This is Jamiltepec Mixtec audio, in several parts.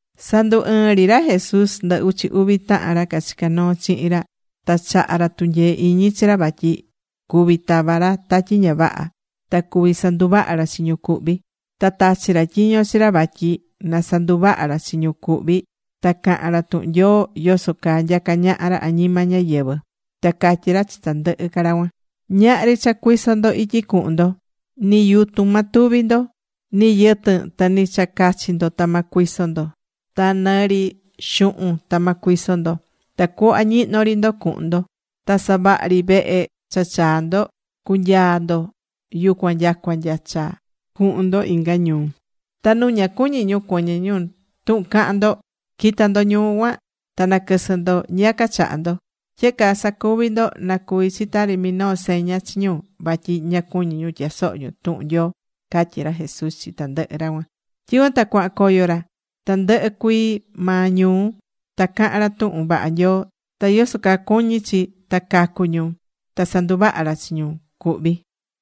Sandu ɨɨn ri ra Jesús ndɨ uchi uvi tahan ra cachicá noo chihin ra. Ta chaha̱ ra tunyee iñi chi ra vatyi cuví tava ra tatyi ña vaha, ta cuví sanduvaha ra chi ñu cuhví. Ta tachi̱ ra tyiño chi ra vatyi na sanduvaha ra chi ñu cuhví, ta cahan ra tuhun Nyoo yoso caa nyacá ñaha ra añima ñáyɨvɨ. Ta catyí ra chi tandɨhɨ ra cuan: ―Ñahri cha cuison ndo ityi cuhun ndo, ni yutun ma tuvi ndo. Ni yɨtɨn, ta nɨ ri cha cachi ndo ta ma cuison ndo. Ta nɨ ri xuhun ta ma cuison ndo. Tacuhva ñihnó ri ndo cu̱hun ndo. Ta savaha ri vehe cha chaa ndo, cu̱nyaa ndo yucuan nyacua nya cha chaa quɨvɨ cha cuhun ndo inga ñuu. Ta nu ña cuñí ñu cuɨñɨ ñu tuhun cahan ndo, qui̱ta ndo ñuu cuan. Ta na̱quɨsɨ ndo ñiyaca chaha ndo. Tyehe caa sa̱cuvi ndo na cuvi chi tari minoo seña chi ñu, vatyi ña cuñí ñu tyasoho ñu tuhun Nyoo ―catyí ra Jesús chi tandɨhɨ ra cuan. Tyicuan ta cuahan coyo ra tandɨhɨ cuii maa ñuu. Ta cahán ra tuhun vaha Nyoo ta yoso caa cuñí chi ta cacu ñu. Ta sanduvaha̱ ra chi ñu cuhvi̱.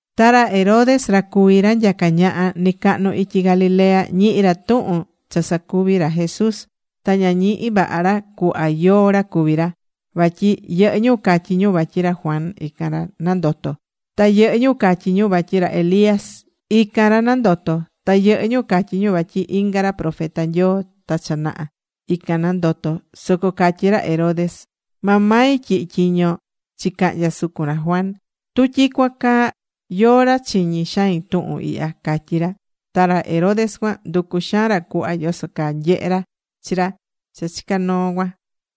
Ra Herodes ra cuví ra nyacá ñaha nɨcahnu ityi Galilea, ñihi̱ ra tuhun cha sacuví ra Jesús. Ta ña ñihi̱ vaha ra cuhva yóó ra cuví ra. Vatyi yɨhɨ́ ñu catyí ñu vatyi ra Juan, ican ra nandoto̱. Ta yɨhɨ́ ñu catyí ñu vatyi ra Elías, ican ra nandoto̱. Ta yɨhɨ́ ñu catyí ñu vatyi inga ra profeta Nyoo ta cha naha, ican nandoto̱. Soco catyí ra Herodes: ―Maa mai tyihi̱ tyiño chicahnya sucun ra Juan. ¿Tu tyicuan caa, yóó ra chiñí xain tuhun ihya? ―catyí ra. Ta ra Herodes cuan nducú xaan ra cuhva yoso caa nyehe ra chi ra cha chicá noo cuan.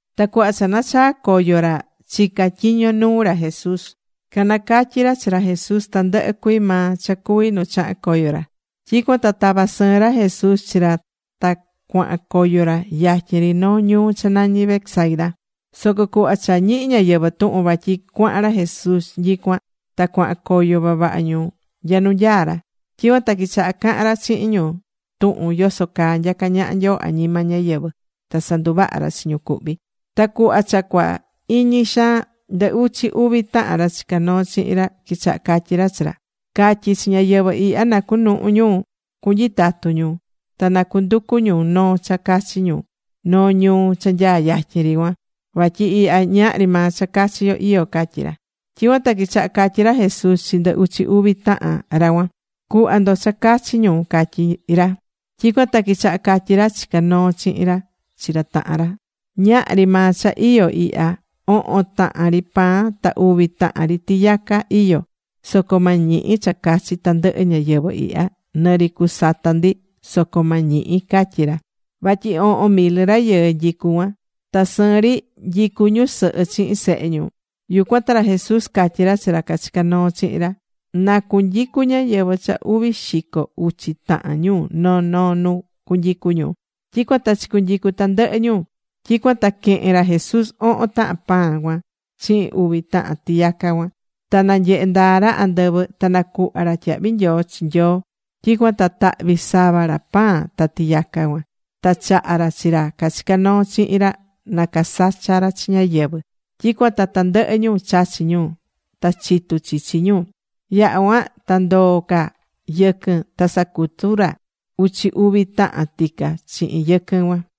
Ta cuhva cha nachaa̱ coyo ra chicá tyiño nuu ra Jesús, canacatyi̱ ra chi ra Jesús tandɨhɨ cuii maa cha cuvi̱ nu chaha̱n coyo ra. Tyicuan ta tava̱ sɨɨn ra Jesús chi ra ta cuahan coyo ra yatyin ri noo ñuu cha nañí Betsaida. Soco cuhva cha ñihi̱ ñáyɨvɨ tuhun vatyi cuahan ra Jesús nyicuan, ta cuahan coyo vavaha ñu nya nu nyaá ra. Tyicuan ta quichaha cahan ra chihin ñu tuhun yoso caa nyacá ñaha Nyoo añima ñáyɨvɨ. Ta sanduvaha̱ ra chi ñu cuhví. Ta cuhva cha cua iñi xaan, ndɨ uchi uvi tahan ra chicá noo chihin ra quichaha catyí ra chi ra: ―Ca̱tyi chi ñáyɨvɨ ihya na cunuhu ñu cunyitatu ñu, ta na cunducu ñu noo cha cachi ñu noo ñuu cha nyaá yatyin ri cuan. Vatyi ihya ñahri maa cha cachi yo iyó ―catyí ra. Tyicuan ta quichaha catyí ra Jesús chi ndɨ uchi uvi tahan ra cuan: ―Cu̱hva ndo cha cachi ñu ―catyí ra. Tyicuan ta quichaha catyi ra chicá noo chihin ra chi ra tahan ra: ―Ñahri maa cha iyó ihya. Ohon tahan ri pan, ta uvi tahan ri tiyaca iyó. Soco ma ñihi cha cachi tandɨhɨ ñáyɨvɨ ihya. Nɨ ri cusata ndi soco ma ñihi ―catyí ra. Vatyi ohon mil rayɨɨ nyicú yucuan. (Ta sɨɨn ri nyicú ñusɨhɨ chihin sehe ñu.) Yucuan ta ra Jesús catyí ra chi ra cachicá noo chihin ra: ―Na cunyicu ñáyɨvɨ cha uvi xico uchi tahan ñu noo noo nu cunyicu ñu. Tyicuan ta chicunyicu̱ tandɨhɨ ñu. Tyicuan ta quehe̱n ra Jesús ohon tahan pan cuan chihin uvi tahan tiyaca cuan. Ta nanyehe̱ ndaa ra andɨvɨ, ta nacuhva̱ ra tyahvi nyoo chi Nyoo. Tyicuan ta tahvi̱ sava ra pan ta tiyaca cuan. Ta chaha̱ ra chi ra cachicá noo chihin ra na casacha ra chi ñáyɨvɨ. Tyicuan ta tandɨhɨ ñu chachi̱ ñu. Ta chitu chichi ñu. Yaha̱ cuan ta ndoo̱ ca yɨquɨn ta sacutu̱ ra uchi uvi tahan tica chihin yɨquɨn cuan.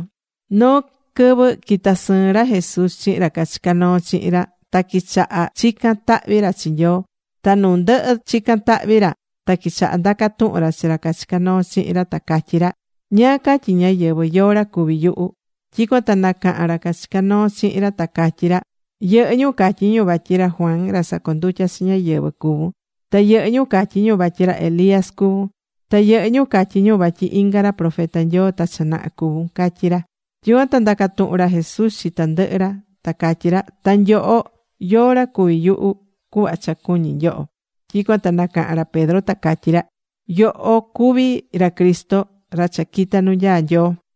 Noo quɨvɨ quita̱ sɨɨn ra Jesús chihin ra cachicá noo chihin ra. Ta quichaha chicán tahvi ra chi Nyoo. Ta nu ndɨhɨ chicán tahvi ra, ta quichaha ndaca tuhun ra chi ra chicá noo chihin ra ta catyí ra: ―¿Ñáá catyí ñáyɨvɨ, yóó ra cuví yuhu? Tyicuan ta nacaha̱n ra cachicá noo chihin ra, ta catyí ra: ―Yɨhɨ́ ñu catyí ñu vatyi ra Juan ra sacondutya̱ chi ñáyɨvɨ cuvún. Ta yɨhɨ́ ñu catyí ñu vatyi ra Elías cuvún. Ta yɨhɨ́ ñu catyí ñu vatyi inga ra profeta Nyoo ta cha naha cuvún ―catyí ra. Tyicuan ta ndaca̱ tuhun ra Jesús chi tandɨhɨ ra, ta catyí ra: ―Ta nyoho, ¿yóó ra cuví yuhu, cuhva cha cuñi nyoho? Tyicuan ta nacaha̱n ra Pedro, ta catyí ra: ―Yoho cuví ra Cristo ra cha quita̱ nu nyaá Nyoo.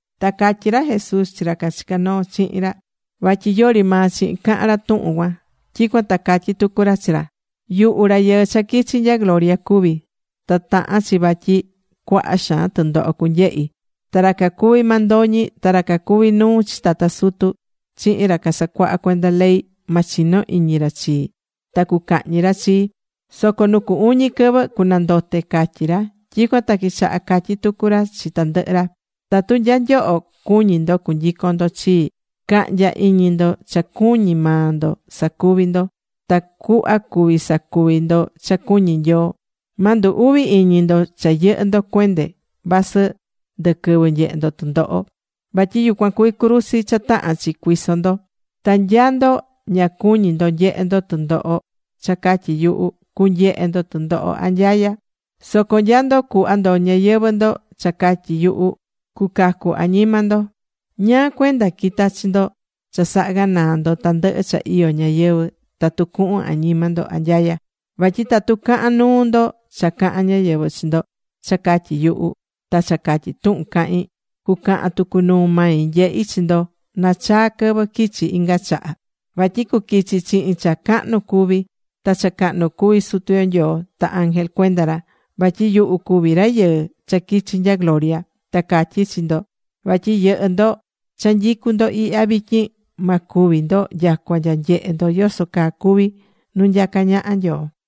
Ta catyí ra Jesús chi ra cachicá noo chihin ra vatyi yori maa chihin cahan ra tuhun cuan. Tyicuan ta catyí tucu ra chi ra: ―Yuhu Rayɨɨ cha quichi̱ nya gloria cuví. Ta tahán chi vatyi cuaha xaan tundoho cunyehi. Ta ra cacuví mandoñi ta ra cacuví nuu chi tata sutu chihin ra casacuaha cuenda ley, ma chino iñi ra chii. Ta cucahñi ra chii. Soco nu cu uñi quɨvɨ cunandote ―catyí ra. Tyicuan ta quichaha catyí tucu ra chi tandɨhɨ ra: ―Tatu nya nyoho cuñí ndo cunyicon ndo chii, ca̱hnya iñi ndo cha cuñí maa ndo sacuvi ndo, tacuhva cuví sacuvi ndo cha cuñí Nyoo. Ma ndu uvi iñi ndo cha yɨhɨ́ ndo cuende vasɨ ndɨquɨvɨ nyehe ndo tundoho. Vatyi yucuan cuví cruzi cha tahán chi cuiso ndo. Ta nya ndo ña cuñí ndo nyehe ndo tundoho cha catyi yuhu, cunyehe ndo tundoho anyaya. Soco nya ndo cuhva ndo ñayɨvɨ̱ ndo cha catyi yuhu, cucacu añima ndo. ¿Ñáá cuenda quita chi ndo cha saha ganaa ndo tandɨhɨ cha iyó ñayɨvɨ̱, tatu cuhun añima ndo anyaya? Vatyi tatu cahan nuu ndo cha cahán ñayɨvɨ chi ndo cha catyi yuhu, ta cha catyi tuhun cahín, cucahan tucu nuu mai nyehi chi ndo nachaa quɨvɨ quichi inga chaha. Vatyi cuquichi chihin cha cahnu cuví, ta cha cahnu cuví Sutu yo Nyoo ta ángel cuenda ra. Vatyi yuhu cuvi Rayɨɨ cha quichi̱ nya gloria. Ta catyí chi ndo vatyi yɨhɨ́ ndo cha nyicú ndo ihya vityin, ma cúvi ndo nyacua nya nyehe ndo yoso caa cuví nu nyacá ñaha Nyoo.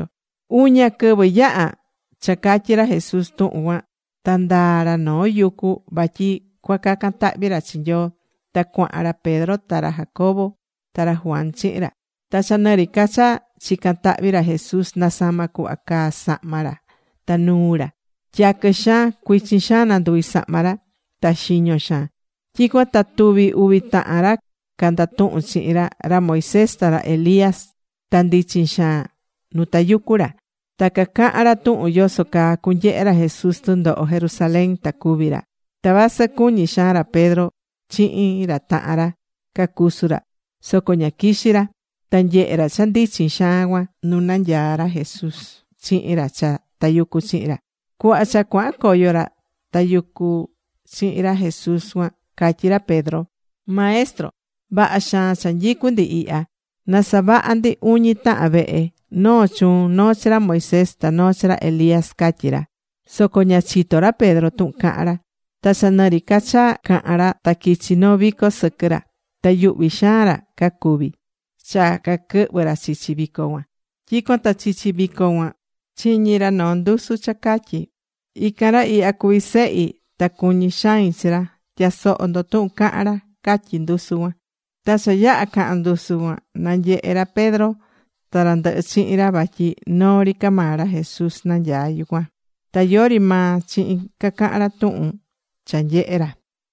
Uña quɨvɨ yaha̱ cha catyi̱ ra Jesús tuhun cuan. Ta ndaa̱ ra noo yucu vatyi cua cacan tahvi ra chi Nyoo. Ta cuahan ra Pedro, ra Jacobo ta ra Juan chihin ra. Ta cha nɨ ri ca cha chicán tahvi ra Jesús, nasama cuhva caá sahma ra ta nuu ra. Tyaquɨ xaan cuichin nanduvi sahma ra. Ta xiño xaan. Tyicuan ta tuvi uvi tahan ra candatuhún chihin ra, ra Moisés ta ra Elías. Ta ndichin xaan nu tayucú ra. Ta cacahán ra tuhun yoso caa cunyehe ra Jesús tundoho Jerusalén ta cúvi ra. Ta vasɨ cuñí xaan ra Pedro chihin ra tahan ra cacusu ra, soco ña quixí ra. Ta nyehé ra cha ndichin xaan cuan nu nanyaá ra Jesús chihin ra cha tayucú chihin ra. Cuhva cha cuahan coyo ra tayucú chihin ra Jesús cuan, catyí ra Pedro: ―Maestro, vaha xaan cha nyicú ndi ihya. Na savaha ndi uñi tahan vehe, noo chuun, noo chi ra Moisés, ta noo chi ra Elías ―catyí ra. Soco ña chitó ra Pedro tuhun cahán ra. Ta cha nɨ ri ca cha cahán ra ta quichi̱ noo vico sɨquɨ ra. Ta yuhví xaan ra cacuví cha caquɨhvɨ ra chichi vico cuan. Tyicuan ta chichi vico cuan chiñi̱ ra noo ndusu cha catyí: ―Ican ra ihya cuví Sehi, ta cuñí xain chi ra. Tya̱soho ndo tuhun cahán ra ―catyí ndusu cuan. Ta cha yaha̱ caha̱n ndusu cuan, nanyehe ra Pedro ta ra ndɨhɨ chihin ra vatyi noo ri ca maa ra Jesús nanyaá yucuan. Ta yori maa chihin cacahan ra tuhun cha nyehe̱ ra.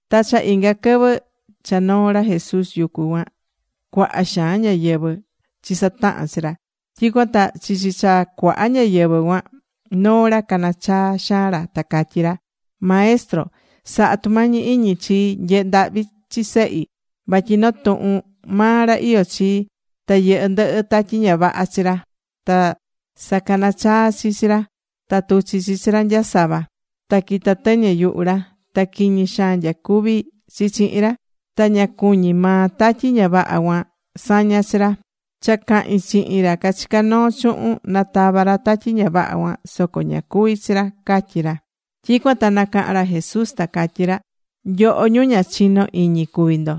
Ta cha inga quɨvɨ cha noo̱ ra Jesús yucu cuan, cuaha xaan ñáyɨvɨ chisataha̱n chi ra. Tyicuan ta chichi cha cuaha ñáyɨvɨ cuan, noo ra cana chaa xaan ra, ta catyí ra: ―Maestro, sa̱ha tumañi iñi chii. Nye̱he ndahvi chi sehi. Vatyi noo tuhun maa ra iyó chii. Ta yɨhɨ́ ndɨhɨ tatyi ña vaha chi ra. Ta sacanachaa chi chi ra. Ta tuchí chi chi ra nyasava. Ta quitá tɨñɨ yuhu ra. Ta quiñi xaan nyacuví chi chihin ra. Ta ña cuñí maa tatyi ña vaha cuan saña chi ra. Cha cahi̱n chihin ra cachicá noo chuhun na tava ra tatyi ña vaha cuan, soco ña cuví chi ra ―catyí ra. Tyicuan ta nacaha̱n ra Jesús ta catyí ra: ―Nyoho, ñu ña chinó iñi cuví ndo.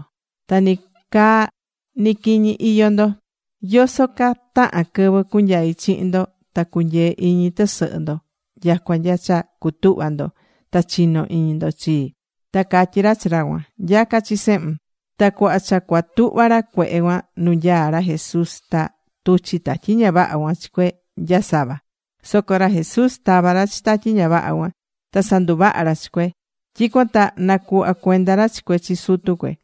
Ta ni caa ni quiñi iyó ndo. ¿Yoso ca tahan quɨvɨ cunyai chihin ndo ta cunyee iñi tɨsɨhɨ ndo nyacua nya cha cutuhva ndo ta chino iñi ndo chii? Ta catyí ra chi ra cuan: ―Nya̱ca chi sehun. Ta cuhva cha cua tuhva ra cuehe cuan nu nyaá ra Jesús, ta tuchi̱ tatyi ña vaha cuan chi cue nya sava. Soco ra Jesús tava̱ ra chi tatyi ña vaha cuan. Ta sanduvaha̱ ra chi cue. Tyicuan ta nacuhva̱ cuenda ra chi cue chi sutu cue.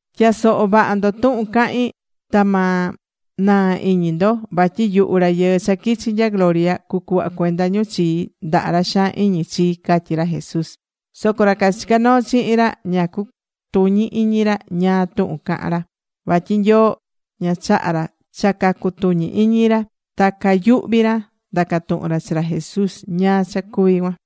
―Tya̱soho vaha ndo tuhun cahín. Ta ma naa iñi ndo. Vatyi yuhu Rayɨɨ cha quichi̱ nya gloria, cucuhva cuenda ñu chii ndaha ra xaan iñi chii ―catyí ra Jesús. Soco ra cachicá noo chihin ra ña cutuñí iñi ra ñáá tuhun cahán ra. Vatyi Nyoo ña chaha̱ ra cha cacutuñi iñi ra. Ta cayuhví ra ndaca tuhun ra chi ra Jesús ñáá cha cuví cuan.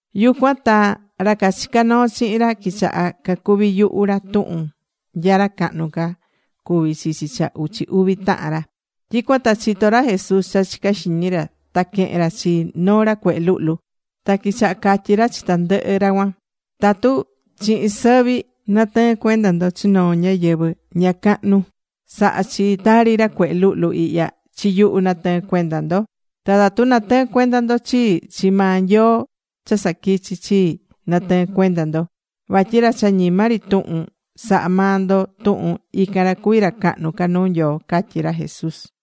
Yucuan ta ra cachicá noo chihin ra quichaha cacuvi yuhu ra tuhun nya ra cahnu ca cuví chichi cha uchi uvi tahan ra. Tyicuan ta chitó ra Jesús cha chicá xiñi ra, ta quehe̱n ra chi noo ra cuehe luhlu. Ta quichaha catyí ra chi tandɨhɨ ra cuan: ―Tatu chihin sɨvi natɨɨ́n cuenda ndo chi noo ñáyɨvɨ ña cahnu sahá chi tari ra cuehe luhlu ihya, chi yuhu natɨɨ́n cuenda ndo. Ta tatu natɨɨ́n cuenda ndo chii, chi maa Nyoo cha saquichi̱ chii, natɨɨ́n cuenda ndo. Vatyi ra cha ñima ri tuhun sahá maa ndo tuhun, ican ra cuví ra cahnu nuu Nyoo ―catyí ra Jesús.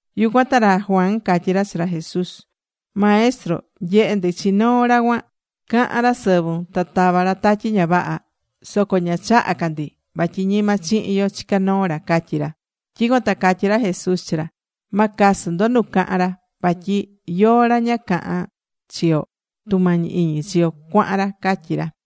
Yucuan ta ra Juan catyí ra chi ra Jesús: ―Maestro, nyehe̱ ndi chi noo ra cuan. Cahán ra sɨvun ta tavá ra tatyi ña vaha. Soco ña chaha̱ ca ndi. Vatyi ñima chihin yo chicá noo ra ―catyí ra. Tyicuan ta catyí ra Jesús chi ra: ―Ma casɨ ndo nu cahan ra. Vatyi yóó ra ña cahán chi yo, tumañi iñi chi yo cuahan ra ―catyí ra.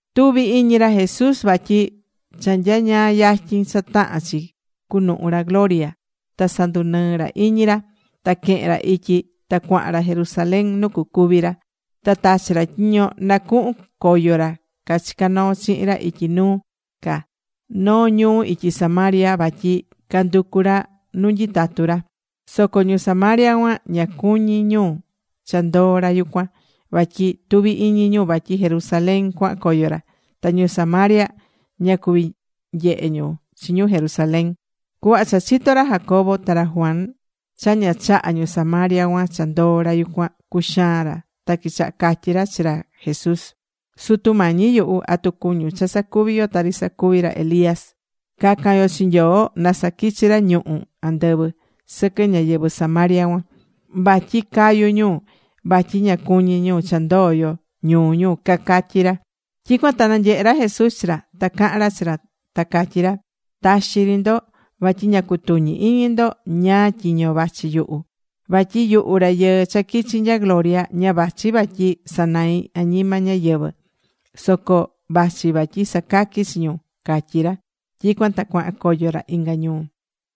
Tuvi iñi ra Jesús vatyi cha nyañaa yatyin cha tahán chi cunuhu ra gloria, ta sandunɨɨ ra iñi ra. Ta quehen ra ityi ta cuahan ra Jerusalén nu cucuví ra. Ta tachi̱ ra tyiño na cuhun coyo ra cachicá noo chihin ra ityi nuu ca noo ñuu ityi Samaria. Vatyi canducu ra nu nyitatu ra. Soco ñu Samaria cuan, ña cuñí ñu cha ndoo ra yucuan, vatyi tuví iñi ñu vatyi Jerusalén cuahan coyo ra, ta ñu Samaria ña cuví nyehe ñu chi ñu Jerusalén. Cuhva cha chitó ra Jacobo ta ra Juan cha ña chahá ñu Samaria cuan cha ndoo ra yucuan, cuxaan ra. Ta quichaha catyí ra chi ra Jesús: ―Sutu Mañi yuhu, ¿atu cuñun cha sacuvi yo tari sacuvi̱ ra Elías? cacan yo chi Nyoo na saquichi ra ñuhu̱ andɨvɨ sɨquɨ ñáyɨvɨ Samaria cuan, vatyi cayu ñu vatyi ña cuñí ñu cha ndoo yo ñuu ñu ―cacatyí ra. Tyicuan ta nanyehe̱ ra Jesús chi ra. Ta cahan ra chi ra ta catyí ra: ―Taxi ri ndo. Vatyi ña cutuñi iñi ndo ñáá tyiño vachi yuhu. Vatyi yuhu Rayɨɨ cha quichi̱ nya gloria, ña vachi vatyi sanai añima ñáyɨvɨ, Soco vachi vatyi sacaqui chi ñu ―catyí ra. Tyicuan ta cuahan coyo ra inga ñuu.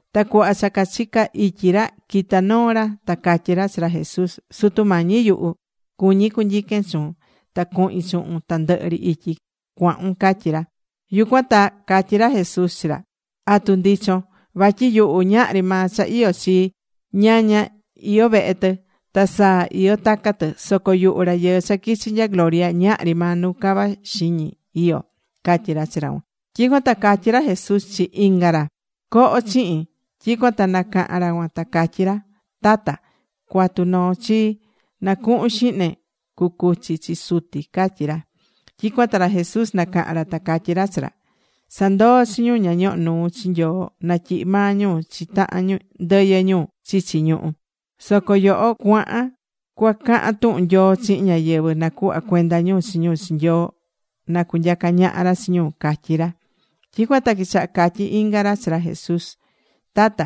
Ta cuhva cha cachica ityi ra, quita noo ra, ta catyí ra chi ra Jesús: ―Sutu Mañi yuhu, cuñí cunyiquen chuun. Ta cuhin chuhun tandɨhɨ ri ityi cuahun ―catyí ra. Yucuan ta catyí ra Jesús chi ra: ―¿Atu ndichon? Vatyi yuhu ñahri maa cha iyó chii. Ñaña iyó vehe tɨ. Ta saa iyó taca tɨ. Soco yuhu Rayɨɨ cha quichi̱ nya gloria ñahri maa nu cava xiñi iyó ―catyí ra chi ra cuan. Tyicuan ta catyí ra Jesús chi inga ra: ―Co̱ho chihin. Tyicuan ta nacaha̱n ra cuan ta catyí ra: ―Tata, cua̱tu noo chii, na cuhun xihne cucuchi chi suti ―catyí ra. Tyicuan ta ra Jesús nacaha̱n ra ta catyí ra chi ra: ―Sa̱ndoo chi ñu ña ñohó nuu chi Nyoo natyihi maa ñu chi tahan ndɨyɨ ñu chichi ñuhu. Soco yoho cua̱han cua cahan tuhun Nyoo chihin ñáyɨvɨ nacuhva cuenda ñu chi ñu chi Nyoo na cunyaca ñaha ra chi ñu ―catyí ra. Tyicuan ta quichaha catyí inga ra chi ra Jesús: ―Tata,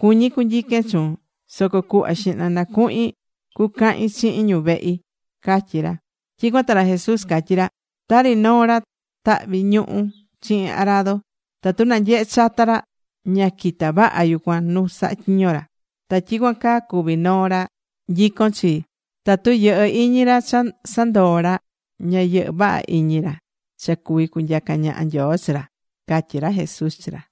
cuñí cunyiquen chuun. Soco cuhva xihna na cuhin cucahin chihin ñu vehi ―catyí ra. Tyicuan ta ra Jesús catyí ra: ―Tari noo ra tahví ñuhú chihin arado, tatu nanyehe chata ra ña quita vaha yucun nu sahá tyiño ra. Ta tyicuan caa cuví noo ra nyicón chii, tatu yɨhɨ́ iñi ra cha sandoo̱ ra, ña yɨhɨ́ vaha iñi ra cha cuví cunyaca ñaha Nyoo chi ra ―catyí ra Jesús chi ra.